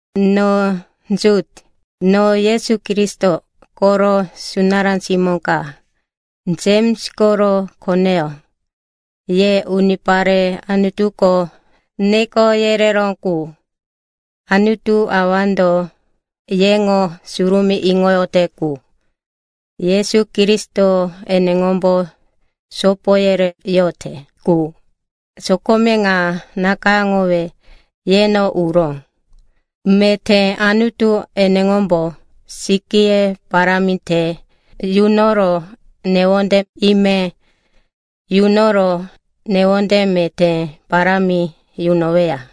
No Jut, no Yesu Kristo koro sunará simó ka, Jems koro koneyó. Ye unipare Anutuko neko yereró qu, Anutu Awando yeŋo surumí iŋoyote qu, Yesu Kristo eneŋombo sopo yereyote qu, sokome ŋa nakayáŋowe yeno uró. Meté Anutu eneŋombo sikíye parámi te yunoro newonde ime yunoro newonde meté parámi yunoweya.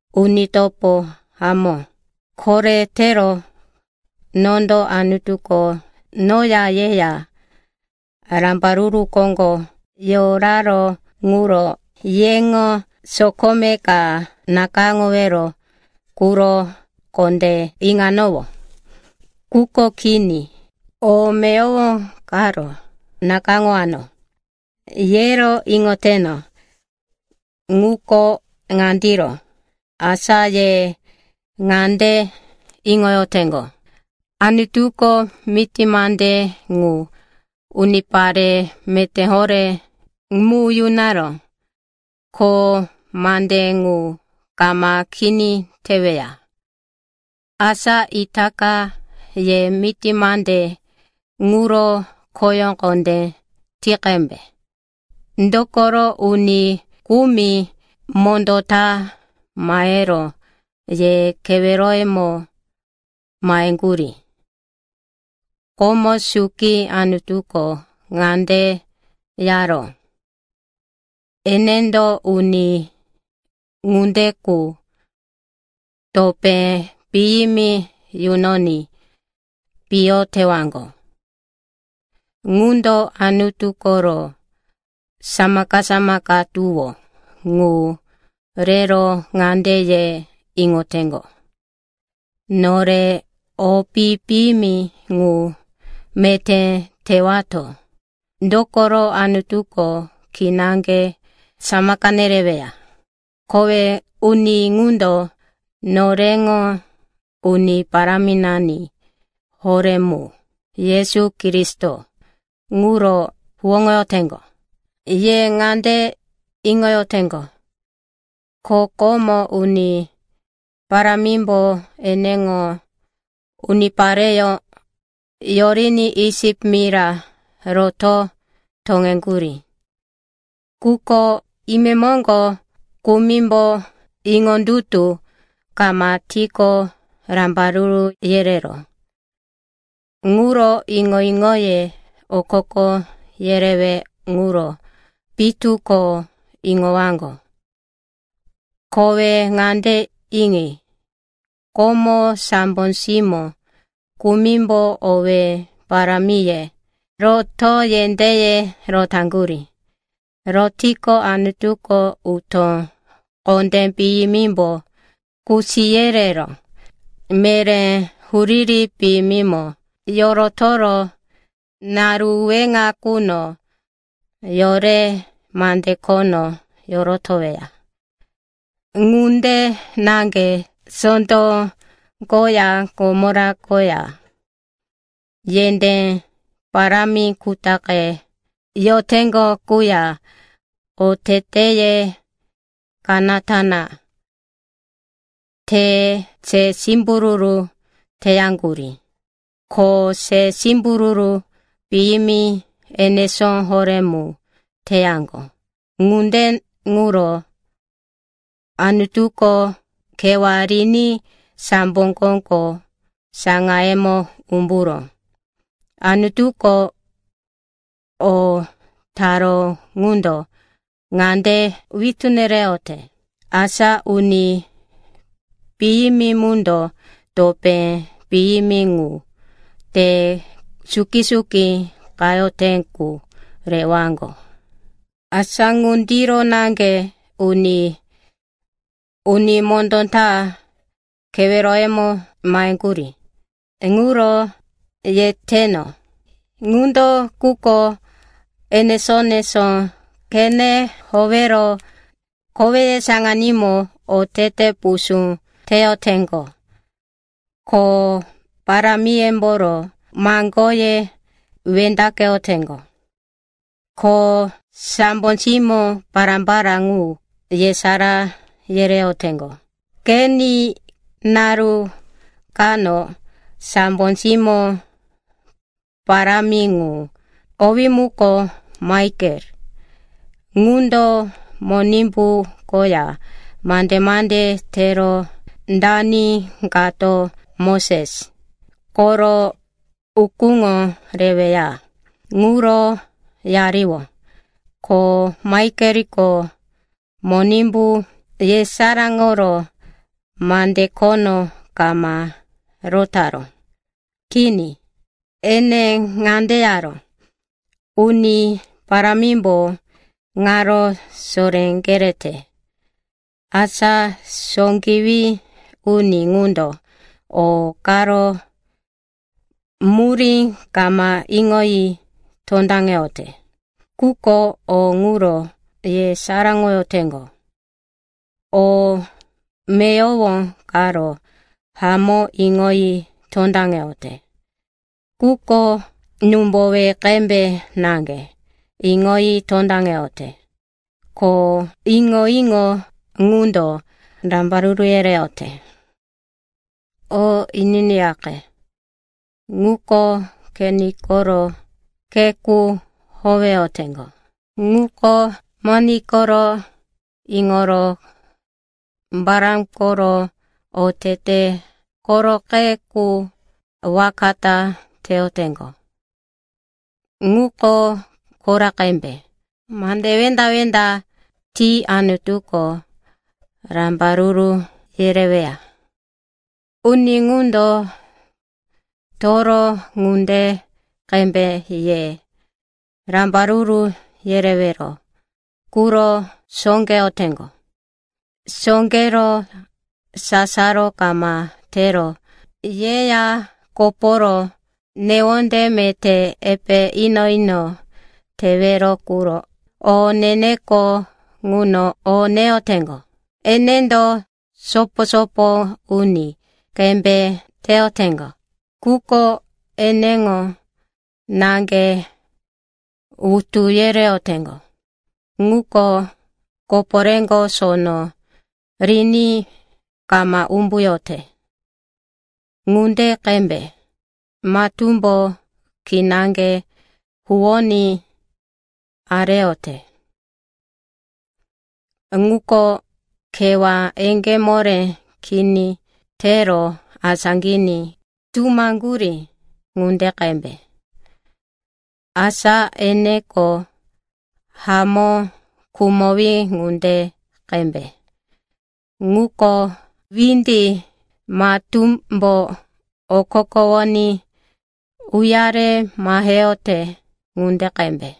Uni topo hamó, koretero nondo Anutuko noya yeya rambaruru koŋgo yoraró ŋuro yeŋo sokome ka nakayáŋowero quro kondé iŋanowó. Quko kini, o meyowo karo nakayáŋowano, yero iŋoteno. Ŋuko ŋandiro, asa ye ŋande iŋoteŋgo, Anutuko miti mande ŋu unipare meté horé mu yunaró, ko mande ŋu kama kini teweya. Asa itaka ye miti mande ŋuro kho kondé ti qembe. Dokoro uni kumi mondó ta mahero ye keweroyemo maheŋgurí. Komo suki Anutuko ŋande yaró, enendo uni ŋunde qu topé piyimi yunoní piyo tewaŋgo. Ŋundo Anutu koro samaka-samaka tuwó ŋu rero ŋande ye iŋoteŋgo, nore o pi-piyimi ŋu meté tewato, dokoro Anutuko kinaŋge samaka nereweya. Kowe uni ŋundo noreŋo Uni Paráminani horé ŋu, Yesu Kristo, ŋuro huwóŋoyoteŋgo. Ye ŋande iŋoyoteŋgo, ko komo Uni Parámimbo eneŋo unipareyó yoriní Isip mira roto toŋeŋgurí. Quko imemoŋgo kumimbo iŋondutu kama tiqo rambaruru yereró. Ŋuro iŋo-iŋoye okoko yerewe ŋuro pitu ko iŋowaŋgo. Kowe ŋande iŋi, komo sambo simó kumimbo owé parámiye rotoro yendéye rotaŋgurí. Rotiqo, Anutuko utó kondé piyimimbo kusi yerero meré huriri piyimimo yorotoro naru weŋa quno yore mande khono yorotoweya. Ŋunde naŋge Sotom koya Gomora koya yendé parámi kutaqe yoteŋgo quya oteteye kanata na tero se simbururu teyaŋgurí. Ko se simbururu piyimi enesó horé mu teyaŋgo. Ŋunde ŋuro Anutuko kewá riní sambo koŋgo saŋayemo umburó. Anutuko o taró ŋundo ŋande witú nereyote, asa uni piyimi mundo topé piyimi ŋu, te suki-suki qayote qu, rewaŋgo. Asa ŋundiro naŋge uni mondó ta keweroyemo maheŋgurí ŋuro yeteno, ŋundo quko enesó-enesó qene howero koweye saŋanímo otete pusú teyoteŋgo, ko parámiyemboro maŋgoye wendaqeyoteŋgo, ko sambo simó pará-pará ŋu yesará yereyoteŋgo. Qeni, naru kano sambo simó parámi ŋu, owí muko Maikel, ŋundo Monimbu koya mande-mande tero dani kato Moses koro ukúŋo reweya ŋuro yariyó. Ko Maikeliko Monimbu yesaráŋoro mande khono kama rotaró. Kini, ene ŋande yaró, “Uni Parámimbo ŋaro soré kerete!” Asa sóqewí uni ŋuko o karo murí kama iŋoyi tondaŋeyote. Quko o ŋuro yesaráŋoyoteŋgo. O meyowo karo hamó iŋoyi tondaŋeyote, quko númbowe qembe naŋge iŋoyi tondaŋeyote. Ko iŋo-iŋo ŋundo rambaruru yereyote. O ininiyaqe. Ŋuko Kein koro khe qu howeyoteŋgo; ŋuko mone koro iŋoro Balam koro otete koroqe qu waka ta teyoteŋgo; ŋuko Kora qembe mande wenda-wenda ti Anutuko rambaruru yereweya. Uni ŋundo toro ŋunde qembe ye rambaruru yerewero quro sóqeyoteŋgo. Sóqero sasaro kama tero yeya koporo newonde meté epe ino-ino tewero quro o ne-neko ŋuno o neyoteŋgo. Enendo sopo-sopo uni qembe teyoteŋgo, quko eneŋo naŋge wutu yereyoteŋgo. Ŋuko koporéko sono riní kama umbuyote ŋunde qembe, matúmbo kinaŋge huwoní areyote. Ŋuko kewá eŋgé moré kini tero asáqiní tumaŋgurí ŋunde qembe, asa eneko hamó khumowí ŋunde qembe. Ŋuko windi matúmbo okokowoní uyare maheyote ŋunde qembe,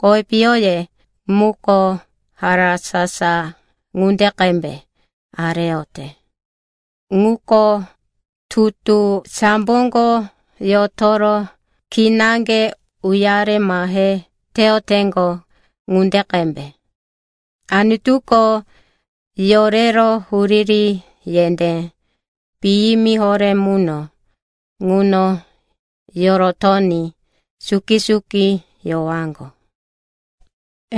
kowi piyoye muko harasasa ŋunde qembe areyote. Ŋuko tutu samboko yotoro kinaŋge uyare mahe teyoteŋgo ŋunde qembe. Anutuko yorero huriri yendé piyimi horé muno ŋuno yorotoní suki-suki yowaŋgo.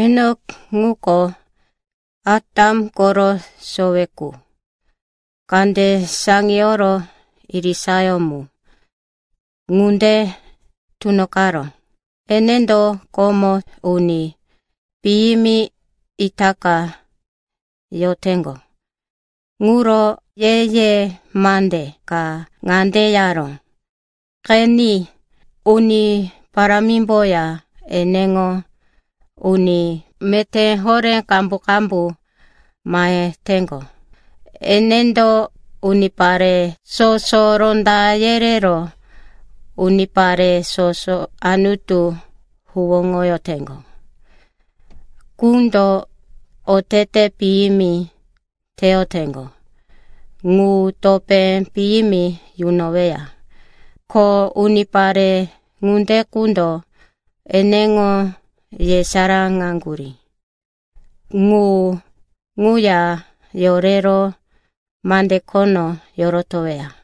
Enok ŋuko Atam koro sowe qu kande saŋiyoro irisayó mu ŋunde tunoqaró. Enendo komo uni piyimi itaka yoteŋgo ŋuro ye-ye mande ka ŋande yaró, “Qeni, Uni Parámimboya eneŋo uni meté horé qambu-qambu maheteŋgo. Enendo unipare soso ronda yerero unipare soso Anutu huwóŋoyoteŋgo qundo otete piyimi teyoteŋgo ŋu topé piyimi yunoweya. Ko unipare ŋunde qundo eneŋo yesaráŋaŋgurí ŋu ŋuya yorero mande khono yorotoweya.”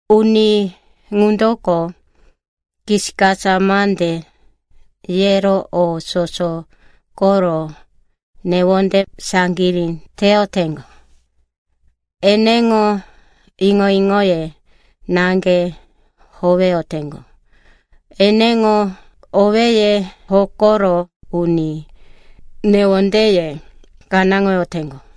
Uni ŋundoko kisikasa mande yero o soso koro newonde saŋgirí teyoteŋgo, eneŋo iŋo-iŋoye naŋge howeyoteŋgo, eneŋo owéye hokoro uni newondeye kanáŋoyoteŋgo.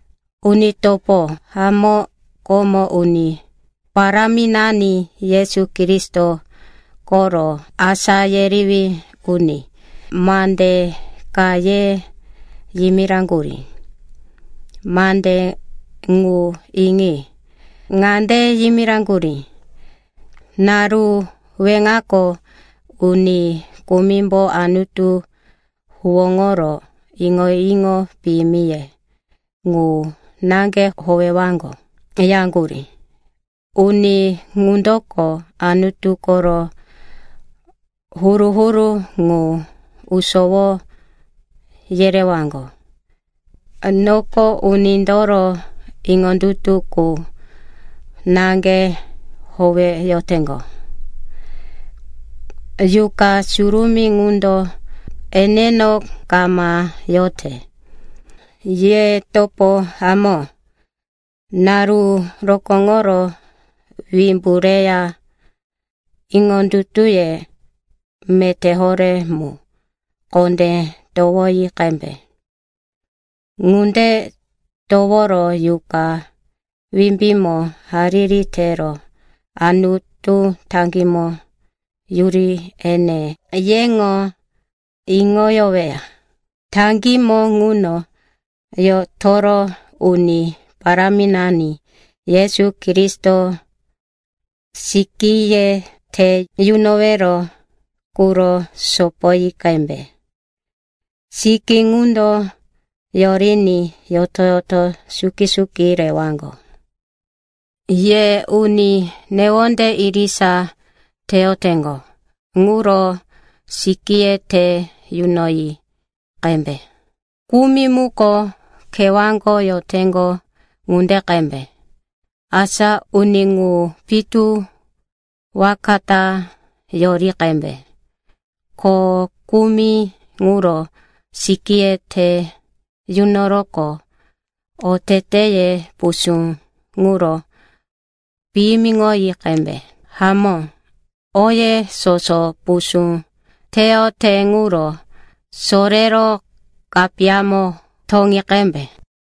Uni topo hamó, komo Uni Paráminani Yesu Kristo koro asá yerewí uni mande ka ye yimiraŋgurí. Mande ŋu iŋi. Ŋande yimiraŋgurí, “Naru weŋako, uni kumimbo Anutu huwóŋoro iŋo-iŋo piyimiye ŋu naŋge howewaŋgo,” yaŋgurí. Uni ŋundoko Anutu koro huru-huru ŋu usowo yerewaŋgo, noko unindoro iŋondutu qu naŋge howeyoteŋgo, Yuqa Surumí ŋundo eneno kama yote. Ye topo hamó, naru rokóŋoro wimbu reya iŋondutuye meté horé mu kondé towoyi qembe. Ŋunde toworo Yuqa wimbímo hariri tero Anutu taŋgímo yuri ene yeŋo iŋoyoweya. Taŋgímo ŋuno yotoro Uni Paráminani Yesu Kristo sikíye te yunowero quro sopoyi qembe. Sikí ŋundo yoriní yoto-yoto suki-suki rewaŋgo. Ye uni newonde irisa teyoteŋgo ŋuro sikíye te yunoyi qembe. Kumi muko kewáko yoteŋgo ŋunde qembe, asa uni ŋu pitu waka ta yori qembe. Ko kumi ŋuro sikíye te yunoroqo oteteye pusú ŋuro piyimiŋoyi qembe. Hamó, oye soso pusú teyote ŋuro sorero kapiyamo toŋi qembe.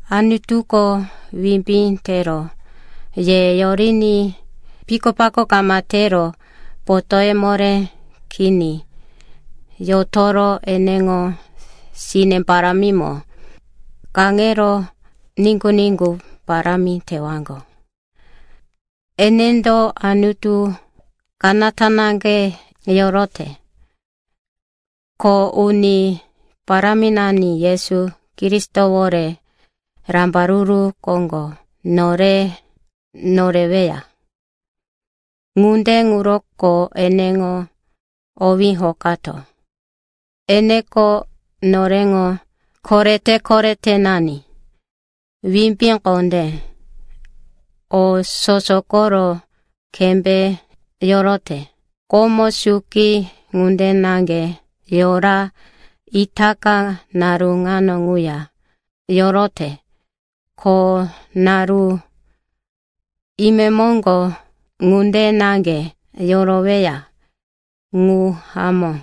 Anutuko wimbí tero ye yoriní pikopako kama tero potóye moré kini yotoro eneŋo sine parámimo kaŋero niŋgu-niŋgu parámi tewaŋgo. Enendo Anutu kanata naŋge yorote, ko Uni Paráminani Yesu Kristowore rambaruru koŋgo nore noreweya. Ŋunde ŋuroko eneŋo owí hokato. Eneko noreŋo korete-koretenani, wimbí kondé, o soso koro kembé yorote. Komo suki ŋunde na yora, itaka naru ŋano ŋuya yorote, ko naru imemoŋgo ŋunde naŋge yoroweya. Ŋu hamó.